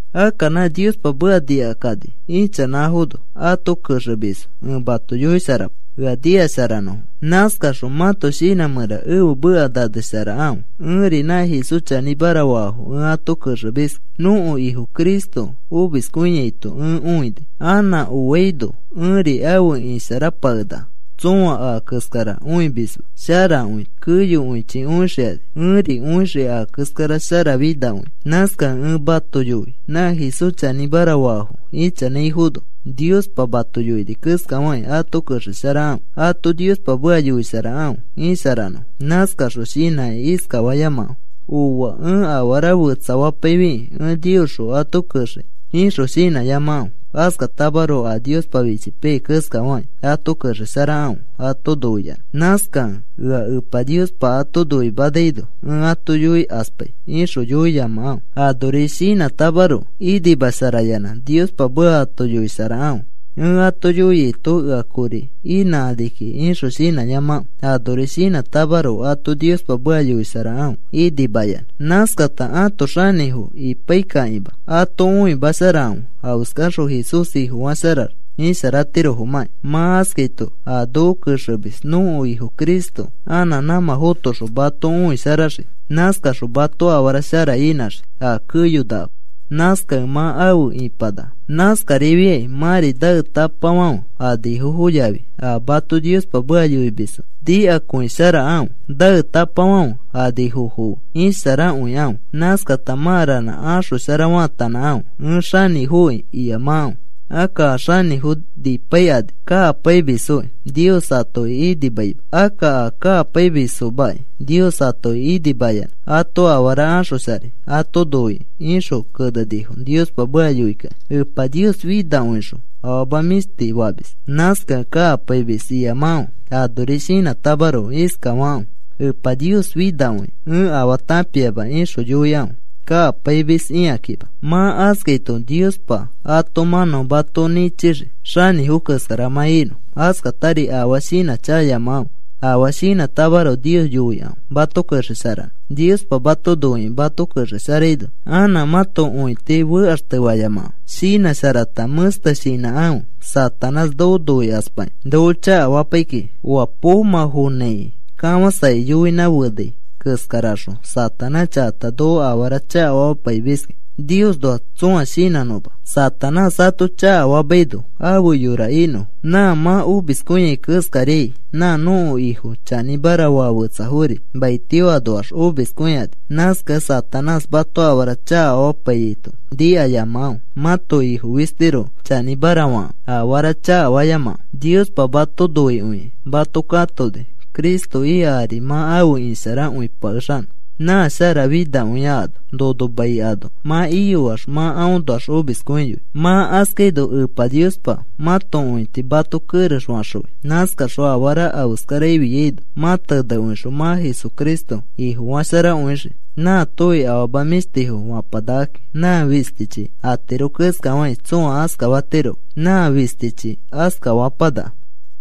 Akka nã Niospa meka nikakani ichanãfono ato kexemisfo, ẽ mato yoisharapai ea nikasharanõfo. Nãskaxõ mãto shinã mẽra ẽfe meka nanesharakãfe. Ẽri nã Jesús chanĩmara faafo ẽ ato kexemiski. Nõko Ifo Cristo omiskõiaito ẽ õini. Anã oaino ẽri afe isharapakenaka. Tsõa a keskara õimisma sharakõi keyokõichi õixikani. Ẽri õixii a keskara sharafinakõia. Nãskakẽ ẽ mato yoi nã Jesús chanĩmara faafo ichanãifono Niospa mato yoini keskafakĩ ato kexesharakãfe. Ato Niospa meka yoisharakãfe isharanõfo. Nãskaxõ shinãkĩ iskafayamakãfe: “Ooa, ẽ afara fetsafapaifikĩ ẽ Niosxõ ato kexei,” ixõ shinãyamakãfe. Askatamaroko a Niospa fichipaiyai keskafakĩ ato kexesharakãfe ato noiyanã. Nãskakẽ, “Ea Niospa ato yoimanaino ẽ ato yoikaspai,” ixõ yoiyamakãfe. Anori shinãtamaroko inimasharayanã Niospa meka ato yoisharakãfe. “Ẽ ato yoiaito ea kori inãkani kiki,” ixõ shinãyamakãfe. Anori shinãtamaroko ato Niospa meka yoisharakãfe inimayanã. Nãskata ãto xanĩfo ipaikakĩma ato õimasharakãfe afeskaxõ Jesús Ifofasharax isharatirofomãkĩ. Mã askaito a noko kexemis, nõko Ifo Jesucristo anã nãmã fotoxõ mato õisharaxii. Nãskaxõ mato afara shara inãxii a keyonakama. Nãskakẽ mã afe ĩpanaka. Nãskarifiakĩ mãri naetapafãfe anifofo yafi a mato Niospa meka yoimisfo nikakõisharakãfe. Naetapafãfe anifofo fe isharakõikãfe. Nãskata mã ranã axoshara faatanãkãfe. “Ẽ xanĩfoki,” iyamakãfe. Akka, “A xanĩfo nipaikani kakapaimisfoki Nios atoki inimaima. Akka a kakapaimisfomaki Nios atoki inimayanã ato afara axosharai ato noikĩ,” ixõ kenenifo Niospa meka yoikakĩ. Epa Nios finakõixõ afama mĩshti famis. Nãskakẽ kakapaimis iyamakãfe. Anori shinãtamaroko iskafakãfe: “Epa Nios finakõia. Ẽ afaa tãpiama,” ixõ yoikãfe kakapaimis ikakĩma. Mã askaito Niospa ato mãnão mato nĩchixii xanĩfo keskara mã inõ. Askatari afaa shinãchakayamakãfe. Afaa shinãtamaroko Nios yoikãfe mato kexesharanõ. Niospa mato noikĩ mato kexesharaino anã mãto õiti fekaxtefayamakãfe. Shinãsharata mẽste shinãkãfe. Satanás noko noikaspakĩ noko chakafapai kiki, oa poomã fonãiki kafãsakĩ yoinã fenai keskaraxõ. Satanás chakata noko afara chakafamapaimiski Niosnoa tsõa shinãnõma, Satanás ato chakafamaino afe yora inõfo. Nã mã omiskõiai keskariai nã nõko Ifo chanĩmara faa fetsafori maitio anoax omiskõikani. Nãskakẽ Satanás mato afara chakafamapaiyaito nikayamakãfe. Mãto Ifo fistiroko chanĩmara fakãfe. Afara chakafayamakãfe. Niospa mato noikõikĩ mato katoni, Cristo ika ari mã afe isharakõipakexanõ nã sharafinakõia ano. Nono mai ano mã iyoax mã aõnoax omiskõiyoi. Mã askaino Epa Niospa mãto õiti mato kerex faxõi. Nãskaxõ afara afeskara afiaino mã tenekõixõ mã Jesucristo Ifofasharakõixii. Nãatofi afama mĩshtifo fapanakaki. Nã fistichi atiro keskafakĩ tsõa askafatiroma. Nã fistichi askafãpanaka.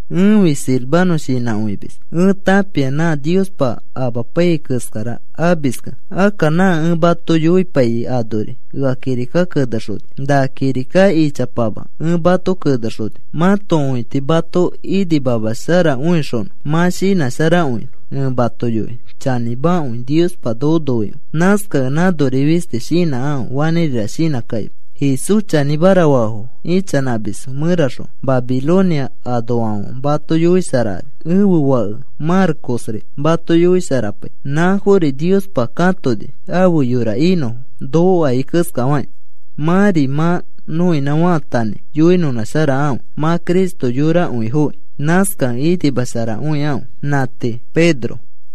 Ẽfi Silvano shinãkõimis. Ẽ tãpia nã Niospa amapaiyai keskara amiskẽ. Akka nã ẽ mato yoipaiyai anori ea kirika kenexoni. Na kirika ichapama ẽ mato kenexoni mãto õiti mato inimamasharakõixonõ mã shinãsharakõinõ. Ẽ mato yoi chanĩmakõi Niospa noko noikõi. Nãskakẽ nãnori fisti shinãkãfe fanĩrira shinãkakima. Jesús chanĩmara faafo ichanãmisfo mẽraxõ Babilonia anoafãfe mato yoisharakani. Ẽfe fake Marcosri mato yoisharapai. Nãfori Niospa katoni afe yora inõfo, noko akai keskafakĩ. Mãri mã nõinã faatanãi yoinõnãsharakãfe. Mã Cristo yorakõifokĩ, nãskakẽ inimasharakõikãfe. Nã tii. Pedro